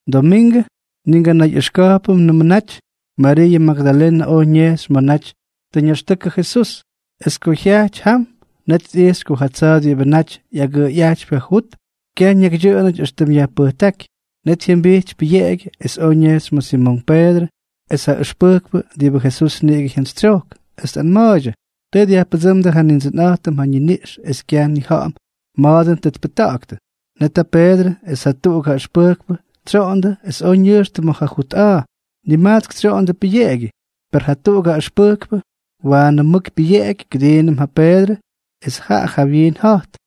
Domingʉ, ni nganayꞌʉxka̱jpʉmnʉm, Mariiʉ Magdalenʉ oj ñejxy ma̱ naty tʉ ñaxtʉkʉ Jesús. Es ko jyajty jam, net tꞌijxy ko ja tsa̱a̱ diꞌibʉ naty ꞌyagʉꞌʉyꞌajtypy ja jut, kyaj ñakydyʉꞌʉnʉty éxtʉm yajpʉjtáky. Net jyʉmbijty pʉyeꞌegyʉ es oj ñejxy ma̱ Simonk Peedrʉ es ja ʉxpʉjkpʉ diꞌibʉ Jesús niꞌigʉ jyantsytsyojk, es tꞌanma̱a̱ydyʉ: —¡Tʉ dyajpʉdsʉ́mdʉ ja Nindsʉnꞌa̱jtʉm ja ñiniꞌx es kyaj nnija̱ꞌa̱m ma̱a̱ dʉn tʉ tpʉjta̱ꞌa̱ktʉ! Net ja Peedrʉ es jatuꞌuk ja ʉxpʉjkpʉ tsyoꞌondʉ es oj ñʉjxtʉ ma̱ ja jut a̱a̱. Nimajtsk tsyoꞌondʉ pʉyeꞌegyʉ, per jatuꞌuk ja ʉxpʉjkpʉ waanʉ mʉk pyʉyeꞌeky kʉdiinʉm ja Peedrʉ es jaꞌa jawyiin ja̱jt.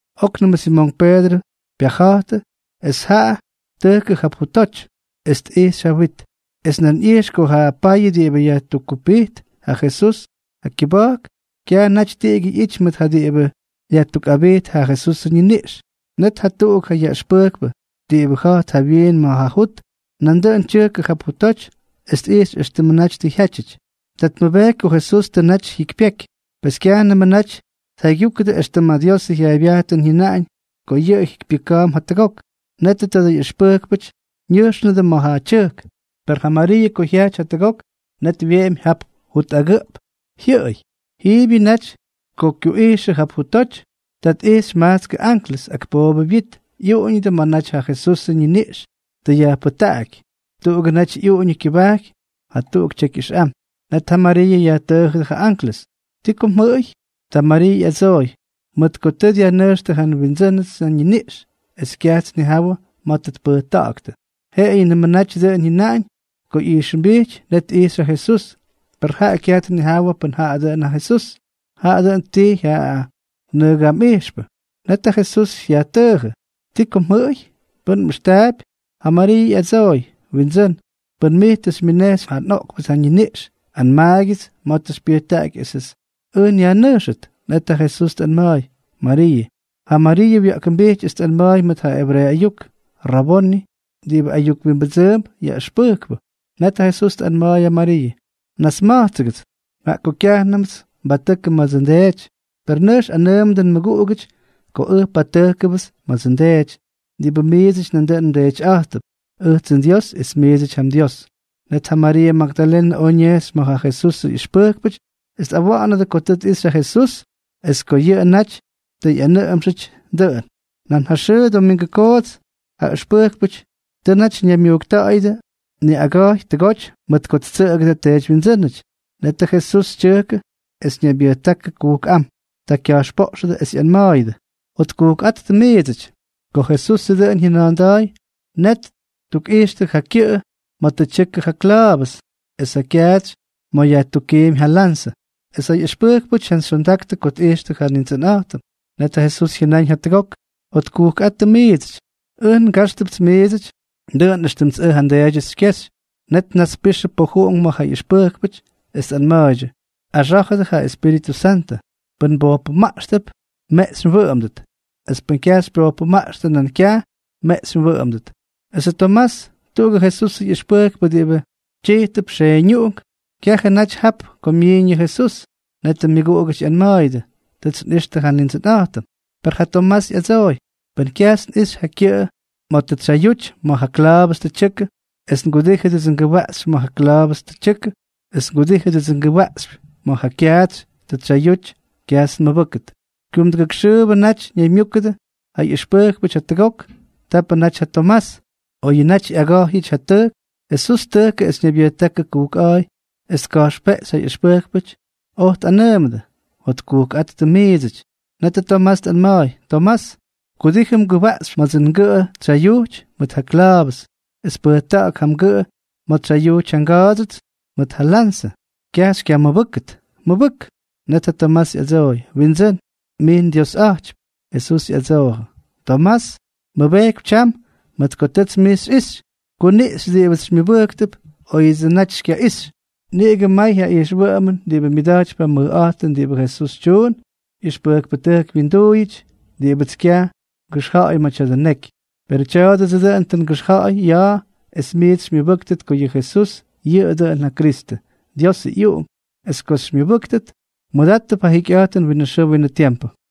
Oknʉmʉ Simonk Peedrʉ pyaja̱jtʉ, es jaꞌa tʉjkʉ jap jutoty es tꞌijxy ja wit, es nan ꞌyijx ko ja payʉ diꞌibʉ yajtukkupijt ja Jesús ja kyʉba̱jk, kyaj naty tiꞌigyʉ ꞌyity mʉt ja diꞌibʉ yajtukꞌabijt ja Jesusʉ ñiniꞌx. Net jatuꞌuk ja ʉxpʉjkpʉ diꞌibʉ ja̱jt jawyiin ma̱ jut, nandʉꞌʉn tyʉjkʉ jap jutoty es tꞌijxy éxtʉmʉ naty tʉ jyátyʉty. Ta tmʉbejky ko Jesusʉ naty tʉ jyikypyeky. Pes kyajnʉmʉ naty tjaygyúkʉdʉ éxtʉm ja Diosʉ jyaaybyajtʉn jyʉnaꞌañ ko yʉꞌʉ jikypyʉka̱a̱mp jatʉgok. Netʉ tadʉ ꞌyʉxpʉjkpʉty ñʉjxnʉdʉ ma̱ ja tyʉjk. Per ja Mariiʉ ko jyajty jatʉgok, net wyeꞌemy jap jut agʉꞌp jyʉꞌʉy. Jiibyʉ naty ko kyuꞌijxʉ jap jutoty. Ta tꞌijxy majtskʉ anklʉs, ak poobʉ wyit, ꞌyuꞌuñʉdʉ ma̱ naty ja Jesusʉ ñiniꞌx tʉ yajpʉjtaꞌaky. Tuꞌugʉ naty ꞌyuꞌuñʉ kyʉbajky ja Jesús es jatuꞌuk tyeky ʉxꞌam. Net ja Mariiʉ yajtʉʉjʉdʉ ja anklʉs: —¿Ti ko mjʉꞌʉy? Ta Mariiʉ ꞌyadsooy: —Mʉt ko tʉ dyajnʉjxtʉ ja nWindsʉ́nʉdsʉ ñiniꞌx, es kyajts nnijawʉ ma̱ tʉ tpʉjta̱ꞌa̱ktʉ. Jeꞌeyʉnʉmʉ naty dʉꞌʉn jyʉnaꞌañ ko ꞌyijxʉmbijty. Net tꞌijxy ja Jesús, per jaꞌa kyaj tnijawʉ pʉn jaꞌa dʉꞌʉn ja Jesús, jaꞌa dʉn ttijy ja nʉgamꞌijxpʉ. Net ja Jesús yajtʉʉjʉ: —¿Ti ko mjʉꞌʉy? ¿Pʉ́n mꞌʉxtaapy? Ja Mariiʉ ꞌyadsooy: —Windsʉ́n, pʉn mij tʉ xymyʉnejxy ja oꞌkpʉ ñiniꞌx, anmaagyʉts ma̱ tʉ xypyʉjtaꞌaky esʉts ʉj nyajnʉjxʉt. Net ja Jesús tꞌanma̱a̱y: —¡Mariiʉ! Ja Mariiʉ wya̱ꞌkʉmbijty es tꞌanma̱a̱y mʉt ja ebreeʉ ayuk: —¡Raboni (diꞌibʉ ayuk wimbʉdsʉʉmp Yaꞌʉxpʉjkpʉ)! Net ja Jesús tꞌanma̱a̱y ja Mariiʉ: —Nasma̱jtsʉgʉts, jaꞌa ko kyajnʉmts nbatʉkʉ ma̱dsʉ nDeedyʉn. Per nʉjx anʉʉmʉdʉ nmʉguꞌugʉty ko ʉj patʉjkʉnʉpts ma̱dsʉ nDeety diꞌibʉ miidsʉty nandʉꞌʉn mDeetyꞌa̱jttʉp, ʉjtsʉ nDios es miidsʉty ja mDios. Net ja Mariiʉ Magdalenʉ oj ñejxy ma̱ ja Jesusʉ ꞌyʉxpʉjkpʉty es tꞌawa̱ꞌa̱nʉdʉ ko tʉ tꞌixy ja Jesús es ko yʉꞌʉ naty tʉ ꞌyanʉꞌʉmxʉdyʉ dʉꞌʉn. Nan ja xʉʉ domingʉ koots, ja ʉxpʉjkpʉty tʉ naty ñaymyujkta̱ꞌa̱yʉdʉ niꞌaga̱jy tʉgoty mʉt ko ttsʉꞌʉgʉdʉ teedywyindsʉ́nʉty. Netʉ Jesús tyʉjkʉ es ñaybyʉjtákʉ kujkꞌám. Ta kya̱jxpoꞌxʉdʉ es ꞌyanma̱a̱yʉdʉ: —Jotkujkꞌáttʉ miidsʉty. Ko Jesusʉ dʉꞌʉn jyʉna̱a̱nda̱a̱y, net ttukꞌijxtʉ ja kyʉꞌʉ ma̱ tʉ tyʉkʉ ja kla̱a̱vʉs es ja kyaatsy ma̱ tʉ yajtukkímy ja lanzʉ. Es ja ꞌyʉxpʉjkpʉty jyantsyxyondaktʉ ko tꞌixtʉ ja Nindsʉnꞌa̱jtʉm. Netʉ Jesús jyʉnáñ jatʉgok: —Jotkujkꞌáttʉ miidsʉty. Ʉj ngajxtʉpts miidsʉty, dʉꞌʉn éxtʉmts ʉj ja nDeedyʉts xykyejxy. Net tnaspixʉ pojuꞌunk ma̱ ja ꞌyʉxpʉjkpʉty, es tꞌanma̱a̱ydyʉ: —Axá̱jʉdʉ ja Espíritʉ Santʉ. Pʉ́n mbojpʉmaꞌxtʉp, meꞌxy wyʉꞌʉmʉt; es pʉ́n kyaj mbojpʉmaꞌxtʉ, nan kyaj meꞌxy wyʉꞌʉmʉt. Esʉ Tomás, tuꞌugʉ Jesusʉ ꞌyʉxpʉjkpʉ diꞌibʉ tyijtʉp Xeeñuꞌunk, kyajʉ naty jap ko myiiñ yʉ Jesús. Net ja myʉguꞌugʉty ꞌyanma̱a̱yʉdʉ: —Tʉts nꞌixtʉ ja Nindsʉnꞌa̱jtʉm. Per ja Tomás ꞌyadsooy: —Pʉn kyajts nꞌixy ja kyʉꞌʉ ma̱ tʉ tsyayuty ma̱ ja kla̱a̱vʉs tʉ tyʉkʉ, es ngudíjʉdsʉ ngʉwaꞌxypy ma̱ ja kla̱a̱vʉs tʉ tyʉkʉ, es ngudíjʉdsʉ ngʉwaꞌxypy ma̱ ja kyaatsy tʉ tsyayuty, kyajts nmʉbʉ́kʉt. Kyumduktujk xʉʉbʉ naty ñaymyúkʉdʉ ja ʉxpʉjkpʉty jatʉgok. Tapʉ naty ja Tomás. Oyʉ naty ꞌyaga̱jyʉty ja tʉjk, Jesús tʉjkʉ es ñaybyʉjtákʉ kujkꞌa̱a̱y es tka̱jxpeꞌxy ja ꞌyʉxpʉjkpʉty, oj tꞌanʉʉmʉdʉ: —Jotkujkꞌáttʉ miidsʉty. Netʉ Tomás tꞌanma̱a̱y: —Tomás, kudijʉ mgʉwaꞌxypy ma̱dsʉ ngʉꞌʉ tsyayujty mʉt ja kla̱a̱vʉs, es pʉjta̱ꞌa̱k ja mgʉꞌʉ ma̱ tsyayujty ja nga̱a̱dsyʉts mʉt ja lanzʉ. ¡Kyaj xykyamʉbʉ́kʉt, mʉbʉk! Net ja Tomás ꞌyadsooy: —Windsʉ́n, mij nDiosꞌa̱jtypy. Jesús ꞌyadsoojʉ: —Tomás, mmʉbejkypy tyam mʉt ko tʉts mij xyꞌixy. Kuniꞌxy diꞌibʉts xymyʉbʉjktʉp óyʉdsʉ naty xykyaꞌixtʉ. Niꞌigʉ may ja ijxwʉꞌʉmʉn diꞌibʉ myʉda̱jtypy ja mʉjꞌa̱jtʉn diꞌibʉ Jesús tyuun ꞌyʉxpʉjkpʉtʉjk wyinduuyʉty diꞌibʉts kyaj ngʉxja̱a̱y ma̱ tya̱dʉ neky. Perʉ tya̱a̱dʉdsʉ dʉꞌʉn tʉ ngʉxja̱ꞌa̱y ya̱a̱ es miits xymyʉbʉ́ktʉt ko yʉ Jesús yʉꞌʉ dʉꞌʉn ja Kristʉ, Diosʉ ꞌyUꞌunk, es ko xymyʉbʉ́ktʉt, mmʉdáttʉp ja jikyꞌa̱jtʉn winʉ xʉʉ winʉ tiempʉ.